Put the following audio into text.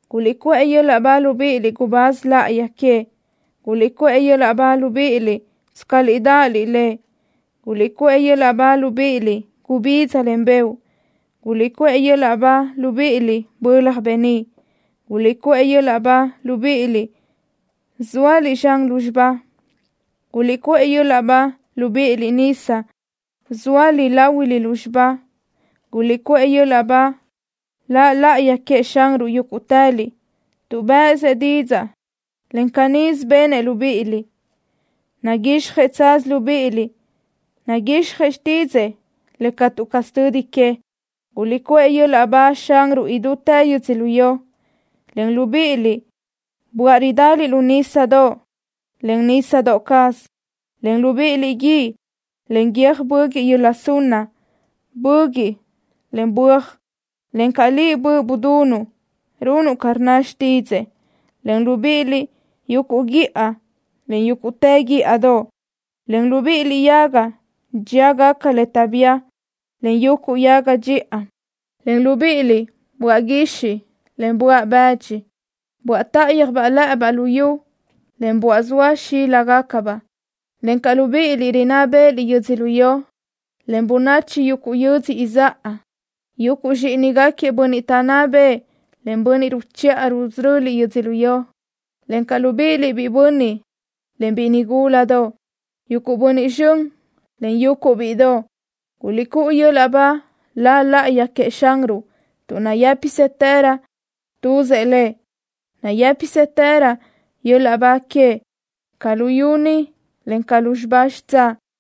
¡Guliʼcuʼë yöl-laʼ ba, libíʼiliʼ gubáz láʼayi queëʼ! ¡Guliʼcuʼë yöl-laʼ ba, libíʼiliʼ tscaliʼ dáʼaliʼ Lëʼ! ¡Guliʼcuʼë yöl-laʼ ba, libíʼiliʼ gubidza, en beoʼ! ¡Guliʼcuʼë yöl-laʼ ba, libíʼiliʼ bölaj beníʼ! ¡Guliʼcuʼë yöl-laʼ ba, libíʼiliʼ zóaliʼ zxan lúzxiba! ¡Guliʼcuʼë yöl-laʼ ba, libíʼiliʼ nisa, zxóaliʼ láhuilö lúzxiba! ¡Guliʼcúʼu yöl-laʼ ba La laʼayi queëʼ Xanruʼ, yúguʼtëliʼ, tuʼ bë́ʼësëʼ didzaʼ, en canísö benëʼ libíʼiliʼ! Naguixjëʼ tsaz libíʼiliʼ. Naguixjëʼ xtídzëʼë le catu caz tödi que. ¡Guliʼcuʼë yöl-laʼ ba Xanruʼ idútë yödzölió, en libíʼiliʼ böaʼ ridaliʼ lu nísadoʼ, en nísadoʼ caz, en libíʼiliʼ guíʼ, en guiö́j böguiʼ yöla sunna, böguiʼ, en böaj, encaʼ liʼ, böʼ budunuʼ, runuʼ ca rnna xtídzëʼë, en libíʼiliʼ yuguʼ guíʼa, en yúguʼtë guíʼadoʼ, en libíʼiliʼ yaga dxíagaca le taʼbía, en yuguʼ yaga dxiʼa, en libíʼiliʼ böaʼ guixiʼ, en böaʼ bëdxi, böaʼ táʼayöj lë́ʼëbaʼ lu yu, en böaʼ zoa xíligacabaʼ, encaʼ libíʼiliʼ rinná bë́ʼëliʼ yödzölió, en bönachi yuguʼ yödzö izáʼa, yuguʼ zxíʼinigaquiëʼ bönniʼ taʼnná bëʼë, en bönniʼ ruchiʼa rusöröliʼ yödzölió, encaʼ libíʼiliʼ biʼi bönniʼ, en biʼi nigúladoʼ, yuguʼ bönniʼ zxön, en yuguʼ bíʼidoʼ! ¡Guliʼcúʼu yöl-laʼ ba La laʼayi queëʼ Xanruʼ tuʼ nayë́pisëtërö tuzëʼ Lëʼ! ¡Nayë́pisëtërö yöl-laʼ ba queëʼ ca luyú ni, en ca lúzxiba xitsáʼ!